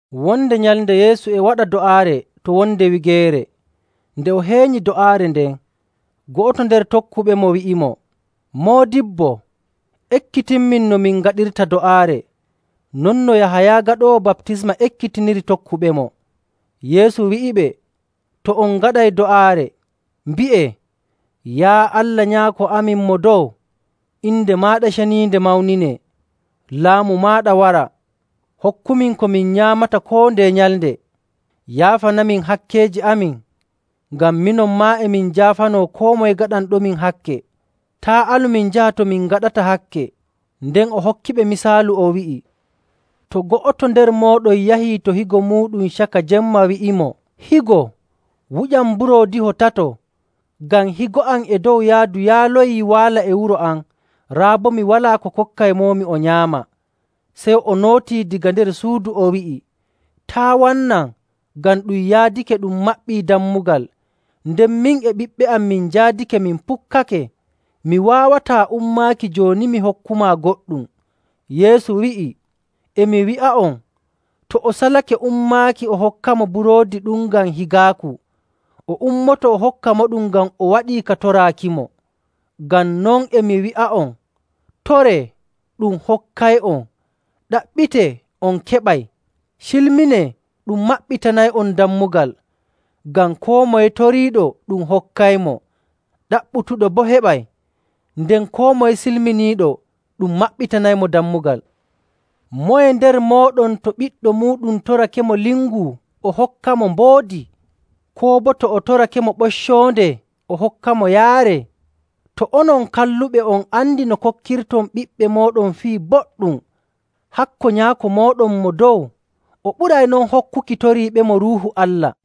Wonde nyalnde Yeesu e waɗa do'aare to wonde wigeere. Nde o heenyi do'aare nden, go'oto nder tokkuɓemo wi'imo, “Moodibbo, ekkitinmin no min ngaɗirta do'aare, non no Yahaya Gaɗoowo Baptisma ekkitiniri tokkuɓemo.” Yeesu wi'iɓe, “To on ngaɗay do'aare, mbi'ee, ‘Yaa Allah Nyaako amin Mo Dow, inde maaɗa ceniinde mawninee, laamu maaɗa wara. Hokkumin ko min nyaamata koo ndeye nyalnde. Yaafanamin hakkeeji amin, ngam minon maa e min njaafanoo koo moye gaɗanɗomin hakke. Taa' alu min njaha to min ngaɗata hakke.’” Nden o hokkiɓe misaalu, o wi'i, “To go'oto nder mooɗon yahii to higo muuɗum caka jemma wi'imo, ‘Higo, wuƴam mburoodiho tato, ngam higo am e dow yaadu yaaloyii waala e wuro am, raa boo mi walaa ko kokkaymomi o nyaama.’ Sey o nootii daga nder suudu, o wi'i, ‘Taa' wannam, ngam ɗum yaadake ɗum maɓɓii dammugal, nden min e ɓiɓɓe am min njaadake min pukkake. Mi waawataa ummaaki jooni mi hokkumaa goɗɗum.’” Yeesu wi'i, “E mi wi'a'on, to o salake ummaaki o hokkamo buroodi ɗum ngam higaaku, o ummoto o hokkamoɗum ngam o waɗii ka toraakimo. Ngam non e mi wi'a'on, toree, ɗum hokkay'on. Ɗaɓɓitee, on keɓay. Cilminee, ɗum maɓɓitanay'on dammugal. Ngam koo moye toriiɗo ɗum hokkaymo, ɗaɓɓutuɗo boo heɓay, nden koo moye cilminiiɗo ɗum maɓɓitanaymo dammugal. Moye nder mooɗon to ɓiɗɗo muuɗum torakemo lingu, o hokkamo mboodi? Koo boo to o torakemo ɓoccoonde, o hokkamo yaare? To onon kalluɓe, on andi no kokkirton ɓiɓɓe mooɗon fii boɗɗum, hakko Nyaako mooɗon Mo Dow! O ɓuray non hokkuki toriiɓemo Ruuhu Allah.”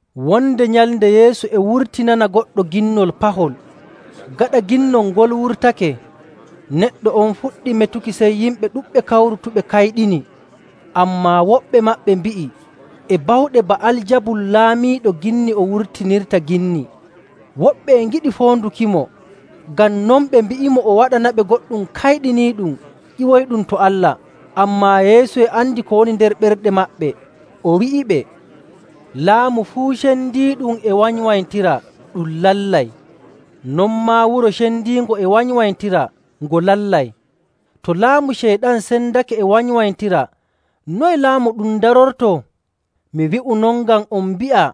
Wonde nyalnde Yeesu e wurtinana goɗɗo ginnol pahol. Gaɗa ginnol ngol wurtake, neɗɗo on fuɗɗi metuki, sey yimɓe ɗuɗɓe kawrutuɓe kayɗini. Ammaa woɓɓe maɓɓe mbi'i, “E bawɗe Ba'aljabul laamiiɗo ginni o wurtinirta ginni.”. Woɓɓe e ngiɗi foondukimo, ngam non ɓe mbi'imo o waɗanaɓe goɗɗum kayɗiniiɗum ƴiwoyɗum to Allah.. Ammaa Yeesu e andi ko woni nder ɓerɗe maɓɓe, o wi'iɓe, “Laamu fuu cendiiɗum e wanywanytira, ɗum lallay. Non maa wuro cendiingo e wanywanytira, ngo lallay. To laamu Ceyɗan sendake e wanywanytira, noye laamu ɗum darortoo? Mi wi'u non ngam on mbi'a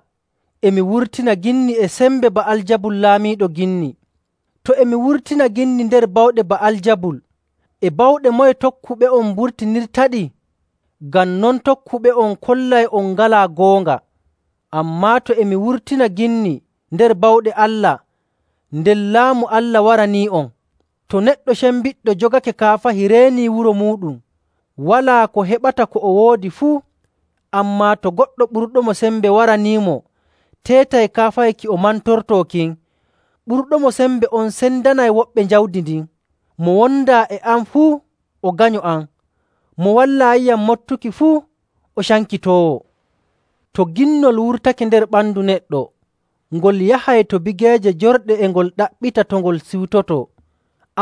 e mi wurtina ginni e sembe Ba'aljabul laamiiɗo ginni. To e mi wurtina ginni nder bawɗe Ba'aljabul, e bawɗe moye tokkuɓe'on mburtinirtaɗi? Ngam non tokkuɓe'on kollay on ngalaa goonga. Ammaa, to e mi wurtina ginni nder bawɗe Allah, nden Laamu Allah waranii'on. “To neɗɗo cembiɗɗo jogake kaafahi reenii wuro muuɗum, walaa ko heɓata ko o woodi fuu. Ammaa, to goɗɗo ɓurɗomo sembe waraniimo teetay kaafahi ki o mantortoo kin, ɓurɗo mo sembe on sendanay woɓɓe jawdi ndin. “Mo wondaa e am fuu, o ganyo am. Mo wallaayiyam moɓtuki fuu, o cankitoowo.. “To ginnol wurtake nder ɓandu neɗɗo, ngol yahay to bigeeje jorɗe e ngol ɗaɓɓita to ngol siwtotoo.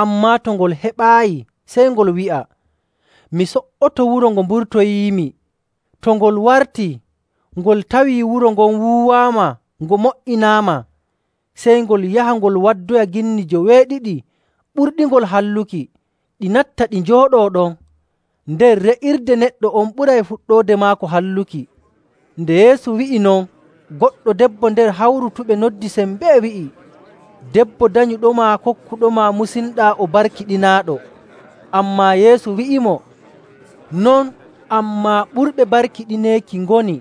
Ammaa to ngol heɓaayi, sey ngol wi'a, ‘Mi so''oto wuro ngo mburtoyiimi.’ To ngol wartii, ngol tawii wuro ngon wuuwaama ngo mo''inaama, sey ngol yaha ngol waddoya ginni joweeɗiɗi ɓurɗingol halluki, ɗi natta ɗi njooɗoo ɗon. Nden re'irde neɗɗo on ɓuray fuɗɗoode maako halluki.” Nde Yeesu wi'i non, goɗɗo debbo nder hawrutuɓe noddi sembee wi'i, “Debbo danyuɗoma kokkuɗoma musinɗaa, o barkiɗinaaɗo.” Ammaa Yeesu wi'imo, “Non, ammaa ɓurɓe barkiɗineeki ngoni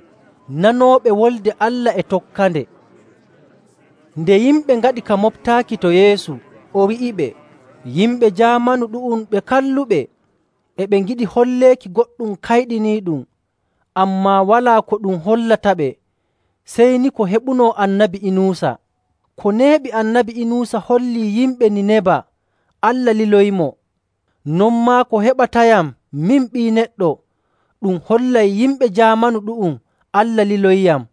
nanooɓe Wolde Allah e tokkande.” Nde yimɓe ngaɗi ka moɓtaaki to Yeesu, o wi'iɓe, “Yimɓe jaamanu ɗu'um ɓe kalluɓe, e ɓe ngiɗi holleeki goɗɗum kayɗiniiɗum, ammaa walaa ko ɗum hollataɓe sey ni ko heɓunoo Annabi Inuusa.. Ko heɓi Annabi Inuusa hollii yimɓe Niineba Allah liloyimo, non maa ko heɓatayam, min Ɓii Neɗɗo, ɗum hollay yimɓe jaamanu ɗu'um Allah liloyiyam..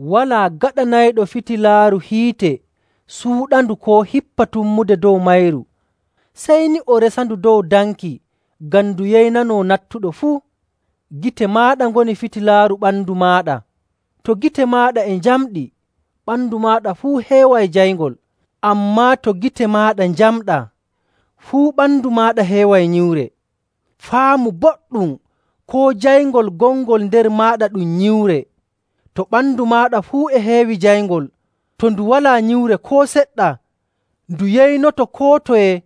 “Walaa gaɗanayɗo fitilaaru hiite suuɗandu koo hippa tummude dow mayru. Sey ni o resandu dow danki ngam ndu yeynanoo nattuɗo fuu.. Gite maaɗa ngoni fitilaaru ɓandu maaɗa. To gite maaɗa e njamɗi, ɓandu maaɗa fuu heeway jayngol, ammaa to gite maaɗa njamɗaa fuu, ɓandu maaɗa heeway nyiwre. Faamu boɗɗum koo jayngol gongol nder maaɗa ɗum nyiwre. To ɓandu maaɗa fuu e heewi jayngol, to ndu walaa nyiwre koo seɗɗa, ndu yeynoto koo toye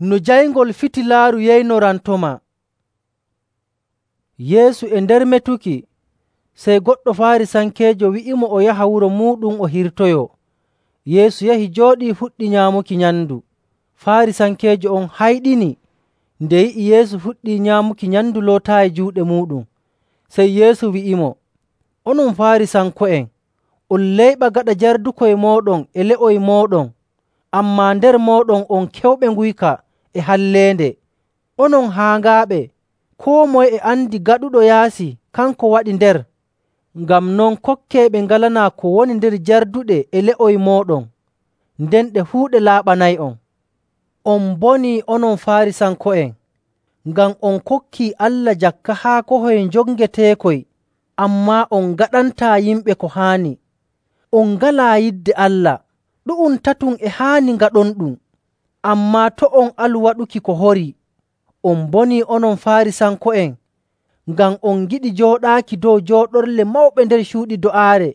no jayngol fitilaaru yeynorantomaa.” Yeesu e nder metuki sey goɗɗo Faarisankeejo wi'imo o yaha wuro muuɗum o hirtoyoo. Yeesu yahi jooɗii fuɗɗi nyaamuki nyamndu. Faarisankeejo on hayɗini nde yi'i Yeesu fuɗɗii nyaamuki nyamndu lootaayi juuɗe muuɗum. Sey Yeesu wi'imo, “Onon Faarisanko'en on layɓa gaɗa njardukoy mooɗon e le'oy mooɗon, ammaa nder mooɗon on keewuɓe nguyka e halleende. Onon haaŋaaɓe! Koo moye e andi gaɗuɗo yaasi kanko waɗi nder. Ngam non kokkee ɓe ngalanaa ko woni nder jarduɗe e le'oy mooɗon, nden ɗe fuu ɗe laaɓanay'on. “On mbonii, onon Faarisanko'en, ngam on kokkii Allah jakka haakohoy njongeteekoy, ammaa on ngaɗantaa yimɓe ko haani, on ngalaa yidde Allah. Ɗu'um tatum e haani ngaɗonɗum, ammaa to' on alu waɗuki ko horii.. “On mbonii, onon Faarisanko'en, ngam on ngiɗi jooɗaaki dow jooɗorle mawɓe nder cuuɗi do'aare,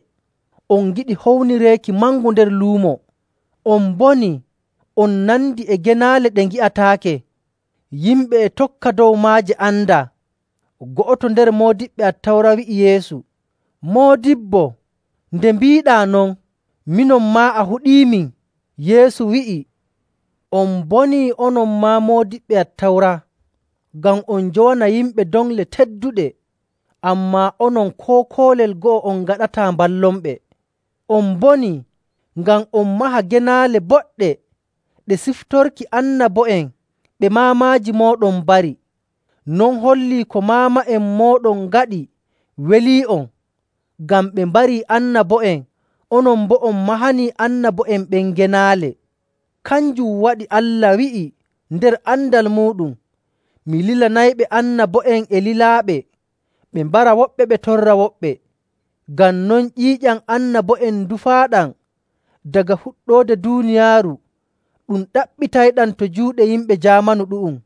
on ngiɗi hownireeki mangu nder luumo. On mbonii! On nandi e genaale ɗe ngi'ataake, yimɓe e tokka dow maaje andaa.” Go'oto nder moodiɓɓe Attawra wi'i Yeesu, “Moodibbo, nde mbiiɗaa non, minon maa a huɗiimin!” Yeesu wi'i, “On mbonii, onon maa moodiɓɓe Attawra, ngam on njowana yimɓe doŋle tedduɗe, ammaa onon koo koolel go'o on ngaɗataa mballonɓe. On mbonii! Ngam on maha genaale boɗɗe ɗe siftorki annabo'en ɓe maamaaji mooɗon mbari. Non hollii ko maama'en mooɗon ngaɗi welii'on, ngam ɓe mbarii annabo'en, onon boo on mahani annabo'en ɓen genaale. Kanjum waɗi Allah wi'i nder andal muuɗum, ‘Mi lilanayɓe annabo'en e lilaaɓe, ɓe mbara woɓɓe ɓe torra woɓɓe.’ Ngam non ƴiiƴam annabo'en ndufaaɗam daga fuɗɗoode duuniyaaru, ɗum ɗaɓɓitayɗam to juuɗe yimɓe jaamanu ɗu'um,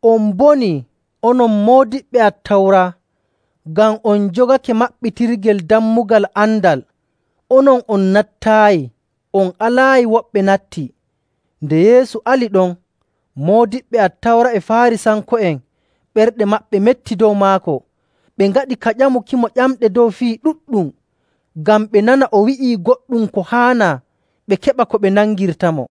“On mbonii, onon moodiɓɓe Attawra, ngam on njogake maɓɓitirgel dammugal andal, onon on nattaayi, on alaayi woɓɓe natti.” Nde Yeesu ali ɗon, moodiɓɓe Attawra e Faarisanko'en ɓerɗe maɓɓe metti dow maako, ɓe ngaɗi ka ƴamukimo ƴamɗe dow fii ɗuɗɗum, ngam ɓe nana o wi'ii goɗɗum ko haanaa, ɓe keɓa ko ɓe nangirtamo.